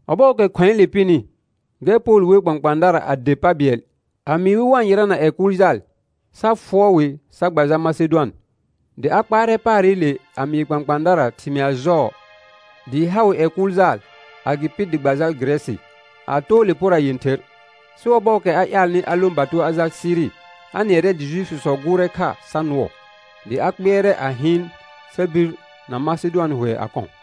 Ɔbɔɔkɛ khʋ̃ɛɛle pɩnɩ, gɛr Pol wer kpãkpãadara a der pa bɩɛl a mɩɩ wɩ wa-n yɩrana ƴɛ kʋʋl jaal, sa fʋɔr wɩ sa gba jal Masedʋan. Dɩ a kpaarɛ paarɩle a mɩɩ kpãkpãadara thɩmɩa jɔɔ dɩɩ ha wɩ ƴɛ kʋʋl jaal, agɩpɩ dɩ gba jal Gɩrɛsɩ a too le pora yẽther. Sɩ ɔbɔɔkɛ a ƴaalnɩ a lõ bato a jal Siri, a nɩɛrɛ dɩ Jnifisɔ gʋʋrɛ kha sa nʋɔ, dɩ a kpɩɛrɛ a hɩɩn sa bir na Masedʋan hʋɛ a kɔ̃.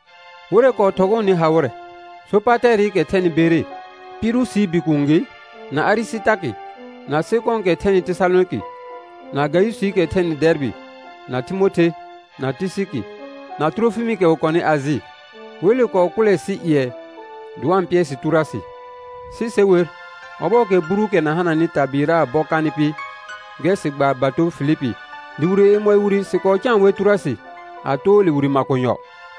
Wɩrɛ kɔɔ thɔgɔɔnɩ ha wɩrɛ: Sopatɛɛrɩkɛ thɛnɩ Bere, Pirusii bikuun gɩ, na Arɩsɩtarkɩ, na Sekɔ̃ɔkɛ thɛnɩ Tesalonɩkɩ, na Gayʋsɩɩkɛ thɛnɩ Dɛɛrbɩ, na Timothe, na Tɩsɩkɩ, na Tʋrofɩmɩkɛ wɩ kɔnɩ Ajɩ. Wele kɔɔ kʋʋlɛ sɩ ƴɩɛ dɩ wa-n pɩɛr sɩ Tʋrʋasɩ. Sɩ se wer, ɔbɔɔkɛ Buruukɛ na hananɩ tabɩɩraa bɔ kanɩ pɩ, gɛr sɩ gbaar bato Filipi, dɩ wire yemɔɩ wire sɩ kɔɔ caan wɛr Tʋrʋasɩ a too le wire makonyɔ.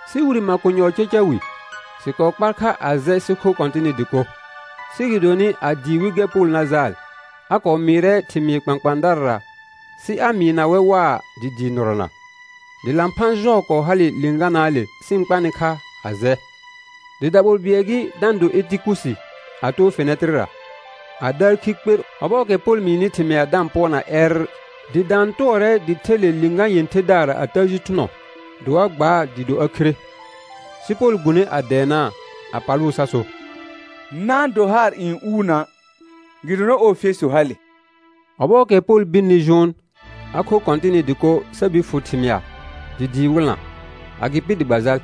Sɩ wire makonyɔɔ caca wi, sɩ kɔɔ kpar kha a jɛ sɩ kho Kɔ̃tɩnɩ dɩko. Sɩ gɩdonɩ, a dɩɩ wɩl gɛr Pol na jaal, a kɔɔ mɩɩrɛ thɩmɩɩr kpãkpãadarara sɩ a mɩɩna wɛr waa dɩ dɩɩ nɩrɔna. Dɩ lãphã jɔɔ kɔɔ hale lɩ̃ganaale sɩ-n kpanɩ kha a jɛ. Dɩ daɓol bɩɛl gɩ da-n do Etikusi a too fɛnɛtɩrɩra, a daar khi kper ɔbɔɔkɛ Pol mɩɩnɩ thɩmɩa da-n pʋɔrna ƴɛrr, dɩ daan tʋɔrɛ dɩ the le lɩ̃gã yẽtherdaara a təə ji thʋnɔ, dɩ wa gbaa dɩɩ do a khire. Sɩ Pol gbune a dɛɛnaa a palʋʋ sa so: Na-n do haar n uu na', gɩdonɩ ɔɔ fesu hale. Ɔbɔɔkɛ Pol birni jʋʋn, a khor Kɔ̃tɩnɩ dɩko sa bir fʋ thɩmɩa dɩ dɩɩ wɩlna; agɩpɩ dɩ gba jal.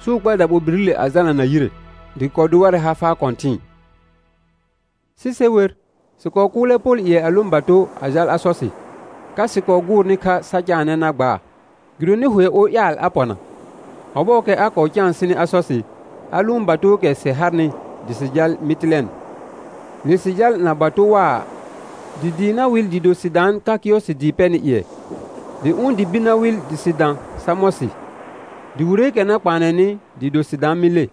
Sɩ wɩ kpar daɓolbirile a jalna na yire, dɩ gɩ kɔɔ do warɛ ha faa kɔ̃tɩ̃ɩ. Sɩ se wer, sɩ kɔɔ kʋʋlɛ Pol ƴɩɛ a lõ bato a jal Asɔsɩ, ka sɩ kɔɔ gʋʋrnɩ kha sa caanɛ na gbaa, gɩdonɩ hʋɛ or ƴaal a pɔna. Ɔbɔɔkɛ a kɔɔ caan sɩnɩ Asɔsɩ, a lʋʋn batookɛ sɩ harnɩ dɩ sɩ jal Mɩtɩlɛn. Le sɩ jal na bato waa, dɩ dɩɩ na wɩl dɩɩ do sɩ daan ka Kɩyɔsɩ dɩɩ pɛnɩ ƴɩɛ. Dɩ ʋ̃ dɩ bir na wɩl dɩ sɩ dã Samɔsɩ, dɩ wireekɛ na kpaanɛnɩ dɩɩ do sɩ daan Mɩle.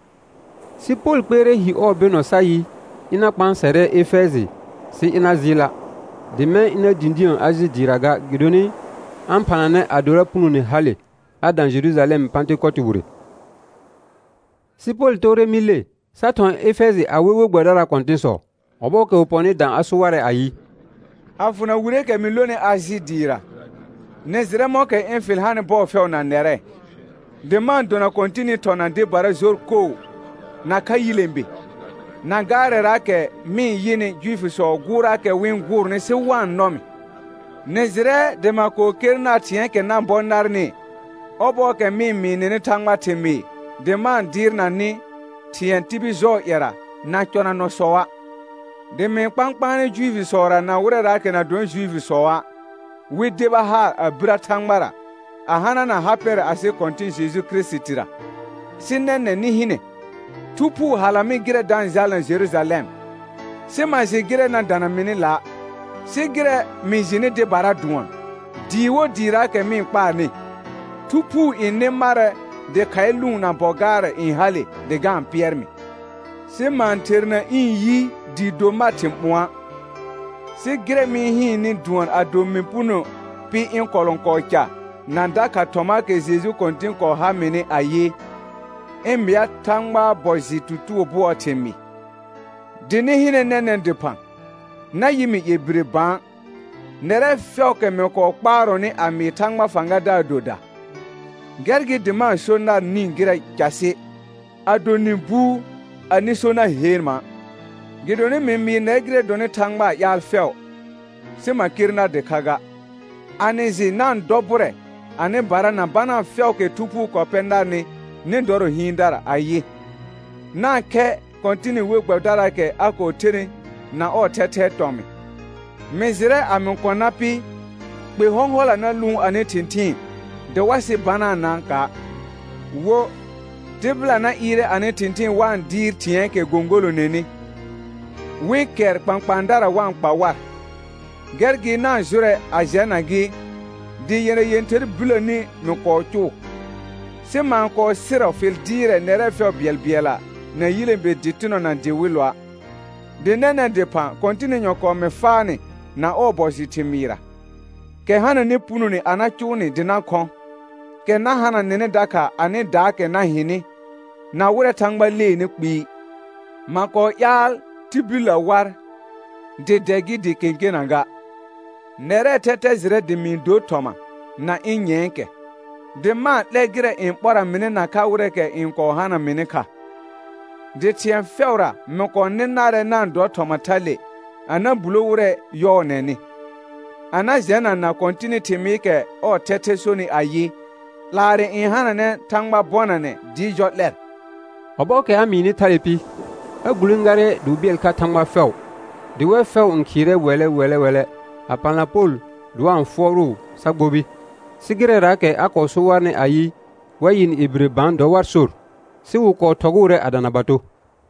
Sɩ Pol kpɩɛrɛ hi ɔɔ bɩnɔ sa yɩ, ɩna kpãasɛrɛ Efɛjɩ sɩ ɩna jɩɩla', dɩ mɛ̃ ɩna dĩdĩə Ajɩ dɩɩra ga; gɩdonɩ a-n phananɛ adora punone hale a dã Jerujalɛm Pãtɩkotɩ wire. Sɩ Pol toore Mɩle, sa thɔ̃ Efɛjɩ a we we gbɛbɩdaraa kɔ̃tɩ̃sɔ. Ɔbɔɔkɛ wɩ pɔnɩ dã a so warɛ ayɩ: A fʋna wireekɛ mɩ lonɩ Ajɩ dɩɩra, nɩ jɩrɛ mɔ̃kɛ ɩ̃ fɩl hanɩ bɔɔ fɛʋ na nɛrɛ, dɩ ma-n dona Kɔ̃tɩnɩ thɔ̃ na dɩbara jor koo, nakha yilẽbe, na gaarɛraakɛ mɩ-n yɩnɩ Juifisɔɔ gʋʋrraakɛ wɩ-n gʋʋrnɩ sɩ wa-n nɔ mɩ. Nɩ jɩrɛ dɩ ma kɔɔ ker nar thɩ̃ɛɛkɛ na bɔ narnɩ, ɔbɔɔkɛ mɩ-n mɩɩ nɩnɩ Thãgbaa thɩmɩɩ dɩ ma-n dɩɩrnanɩ thɩ̃ɛ tibil jɔɔ ƴɛra na cɔnanɔsɔa', dɩ mɩ-n kpãkpaanɛ Juifisɔra na wɩrɛraakɛ na dɔnɩ Juifisɔa', wɩ deba haar a birə Thãgbara a hanana ha pɛrɛ asɩ Kɔ̃tɩ̃ Jeju Kirisitira. Sɩ nɛnɛ̃ nɩ hɩnɛ, Thu Phuu hala mɩ gɩrɛ da-n jalna Jerujalɛm, sɩ ma jɩ gɩrɛ na dana mɩnɩ la'; sɩ gɩrɛ mɩ jɩnɩ dɩbara dʋɔn: Dɩɩ wo dɩɩraakɛ mɩ-n kpaarnɩ, Thu Phuu n nɩ marɛ dɩ khaɩ lʋʋn na bɔ gaarɛ n hale dɩ ga-n pɩɛr mɩ. Sɩ ma-n ɩherna ĩ yi dɩɩ do mar thɩ̃ ɓʋ̃ɔa', sɩ gɩrɛ mɩ-n hɩɩnnɩ dʋɔn ado mɩ puno pɩ ɩ̃ kɔlɔ̃kɔɔ ca na dakha thɔmaakɛ Jeju Kɔ̃tɩn kɔɔ ha mɩnɩ ayɩ, ɩ̃ mɩa Thãgbaa bɔ jɩ tutugo bʋɔɔ thɩmɩɩ. Dɩ nɩ hɩnɛ nɛnɛ̃ dɩphã, na yɩ mɩ ƴɛ bire bã nɛrɛ fɛʋʋkɛ mɩ kɔɔ kpaarɔnɩ a mɩɩ Thãgbaa fãgadaar doda. Gɛr gɩ dɩ ma-n so nar nĩ gɩrɛ casɩ, ado nɩ buu anɩ so na heen ma', gɩdonɩ mɩ mɩɩ nɛr gɩrɛ dɔnɩ Thãgbaa ƴaal fɛʋ sɩ ma ker nar dɩkha ga. A nɩ jɩ na-n dɔ bʋrɛ anɩbara na banaa fɛʋʋkɛ Thu Phuu kɔɔ pɛ narnɩ nɩ dɔrɔ hɩɩndara ayɩ, na-n khɛ Kɔ̃tɩnɩ we gbɛbɩdaraakɛ a kɔɔ thenɩ na ɔɔ thɛthɛɛ tɔmɩ̃. Mɩ jɩrɛ a mɩ kɔ̃ na pɩ, kpe hɔ̃hɔla na lʋʋn anɩ thɩ̃thɩɩn dɩ wa sɩ banaanaaka'; wo, tɩbɩla na ɩɩrɛ anɩ thɩ̃thɩɩn wa-n dɩɩr thɩ̃ɛɛkɛ gõgolonenɩ wɩ kɛr kpãkpãadara wa-n kpa war. Gɛr gɩ na-n jʋrɛ a jɛna gɩ, dɩ yɛna yẽther biləni mɩ kɔɔ cʋʋ, sɩ ma-n kɔɔ sɩrɔ fɩl dɩɩrɛ nɛrɛ fɛʋ bɩɛlbɩɛlla na yilẽbe dɩtɩnɔ na dɩwɩlʋa'. Dɩ nɛnɛ̃ dɩphã Kɔ̃tɩnɩ nyɔ̃kɔɔ mɩ faa nɩ na ɔɔ bɔ jɩ thɩmɩɩra, kɛ hananɩ punone a na cʋʋ nɩ dɩ na khɔ̃, kɛ na hana nɩnɩ dakha anɩdaakɛ na hɩnɩ na wɩrɛ Thãgba leenɩ kpɩɩ. Ma kɔɔ ƴaal tibillə war, dɩ dɛ gɩ, dɩ kẽkena ga. Nɛrɛɛ thɛthɛ jɩrɛ dɩ mɩ-n dor thɔma na ɩ̃ nyɛ̃ɛkɛ, dɩ ma-n 'lɛ gɩrɛ n ɓɔra mɩnɩ nakha wɩrɛɛkɛ n kɔɔ hana mɩnɩ kha. Dɩ thɩ̃ɛ fɛʋra mɩ kɔɔ nɩ narɛ na-n dɔ thɔma thale a na bulo wɩrɛ yɔɔnɛnɩ, a na jɛnana Kɔ̃tɩnɩ thɩmɩɩkɛ ɔɔ thɛthɛ sonɩ ayɩ: 'Laarɛ n hananɛ Thãgba bɔnanɛ dɩɩ jɔ 'lɛr. Ɔbɔɔkɛ a mɩɩnɩ thale pɩ, a gulẽgarɛ dɩ wɩ bɩɛl kha Thãgba fɛʋ. Dɩ wɛr fɛʋ n khɩɩrɛ wɛlɛ wɛlɛ wɛlɛ a palna Pol dɩ wa-n fʋɔrʋʋ sa gbobi; sɩ gɩrɛraakɛ a kɔɔ so warnɩ ayɩ, wa yɩ nɩ ƴɛ bire bã dɔ war sor. Sɩ wɩ kɔɔ thɔgʋʋrɛ a dana bato.